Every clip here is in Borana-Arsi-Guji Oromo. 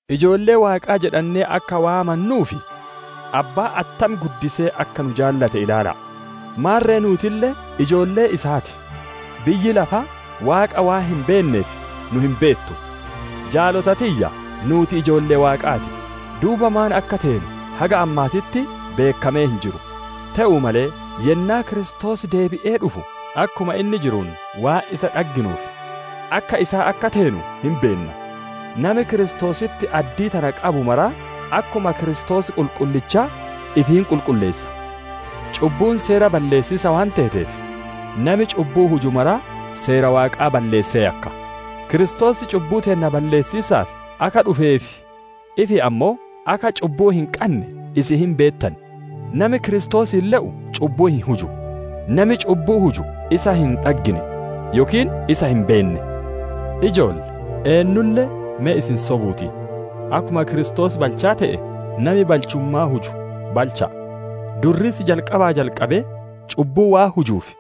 Ijoollee Waaqaa jedhannee akka waammannuuf, Abbaan attam guddisee akka nu jaalate ilaala'a! Maarre nuutille ijoollee isaa ti. Biyyi lafaa Waaqa waan hin beenneef, nu hin beettu. Jaalota tiyya! Nuuti ijoollee Waaqaa ti; duuba maan akka teenu haga ammaatitti beekkamee hin jiru. Te'uu malee yennaa Kiristoos deebi'ee dhufu akkuma inni jiruun waan isa dhagginuuf, akka isaa akka teenu hin beenna. Nami Kiristoositti addii tana qabu mara, akkuma Kiristoos qulqullichaa ifi hin qulqulleessa. Cubbuun seera balleessiisa waan teeteef, nami cubbuu huju mara seera Waaqaa balleessee yakka. Kiristoos cubbuu teenna balleessiisaaf akka dhufee fi ifii ammoo akka cubbuu hin qanne isin hin beettan. Nami Kiristoosiin le'u cubbuu hin huju; nami cubbuu huju isa hin dhaggine, yookiin isaa hin beenne. Ijoolle! Eennulle me isin sobuu ti! Akkuma Kiristoos balchaa te'e, nami balchummaa huju balcha'a. Durriisi jalqabaa jalqabee cubbuu waan hujuuf,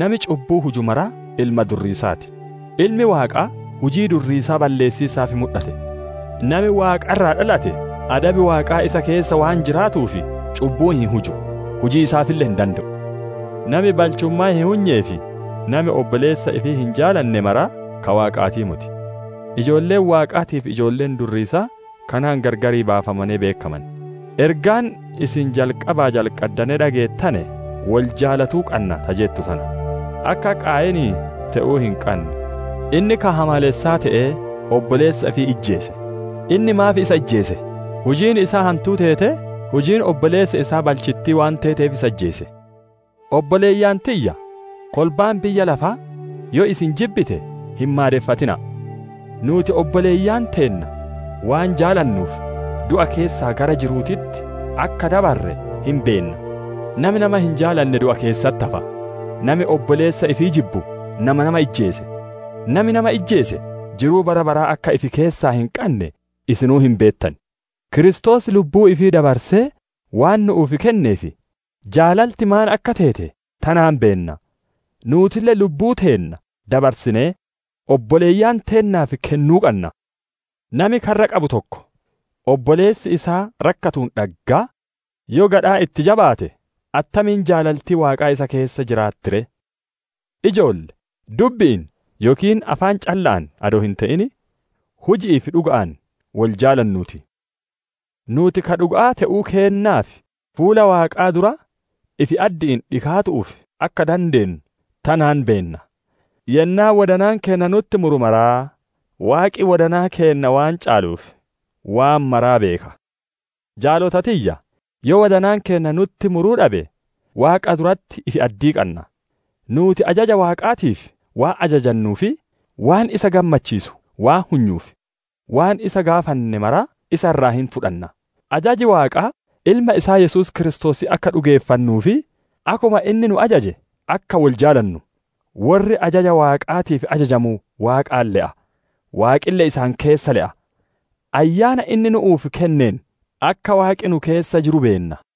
nami cubbuu huju maraa ilma Durriisaa ti. Ilmi Waaqaa hujii Durriisaa balleessiisaaf mudhate. Nami Waaqa irraa dhalate adabi Waaqaa isa keessa waan jiraatuuf cubbuu hin huju, hujiisaafille hin dande'u. Nami balchummaa hin hunyee fi nami obboleessa ifii hin jaalanne mara ka Waaqaatii moti; ijoolleen Waaqaatii fi ijoolleen Durriisaa kanaan gargar baafamanee beekkaman. Ergaan isin jalqabaa jalqaddanee dhageettane, «Wol jaalatuu qanna» ta jettu tana. Akka Qaayinii te'uu hin qannu; inni ka hamaalessaa te'ee obboleessa ifii ijjeese. Inni maaf isa ijjeese? Hujiin isaa hantuu teetee, hujiin obboleessa isaa balchittii waan teeteef isa ijjeese. Obboleeyyan tiyya! Kolbaan biyya lafaa yoo isin jibbite hin maadeffatina'a! Nuuti obboleeyyan teenna waan jaalanuuf du'a keessaa gara jiru'uutitti akka dabarre hin beenna. Nami nama hin jaalane du'a keessatti hafa. Nami obboleessa ifii jibbu, nama nama ijjeese; nami nama ijjeese, jiruu bara baraa akka ifi keessaa hin qanne isinuu hin beettan. Kiristoos lubbuu ifii dabarsee waan nu'uuf kenneef, jaalaltiin maan akka teete tanaan beenna; nuutille lubbuu teenna dabarsinee obboleeyyan teennaaf kennuu qanna. Nami karra qabu tokko obboleessi isaa rakkatuun dhaggaa yoo gadhaa itti jabaate, attamiin jaalaltiin Waaqaa isa keessa jiraatti ree? Ijoolle! Dubbi'iin yookiin afaan calla'aan adoo hin te'in, huji'ii fi dhuga'aan wol jaalannuu ti. Nuuti ka dhuga'aa te'uu keennaa fi fuula Waaqaa dura ifi-addi'iin dhikaatu'uuf akka dandeennu tanaan beenna. Yennaa wodanaan keenna nutti muru maraa, Waaqi wodanaa keenna waan caaluuf, waan maraa beeka. Jaalota tiyya! Yoo wodanaan keenna nutti muruu dhabe, Waaqa duratti ifi-addii qanna. Nuuti ajaja Waaqaatiif waan ajajannuu fi waan isa gammachiisu waan hunyuuf, waan isa gaafanne maraa isa irraa hin fudhanna. Ajaji Waaqaa, Ilma isaa Yesuus Kiristoositti akka dhugeeffannuu fi akkuma inni nu ajaje akka wol jaalannu. Worri ajaja Waaqaatiif ajajamu Waaqaan le'a; Waaqille isaan keessa le'a. Ayyaana inni nu'uuf kenneen, akka Waaqi nu keessa jiru beenna.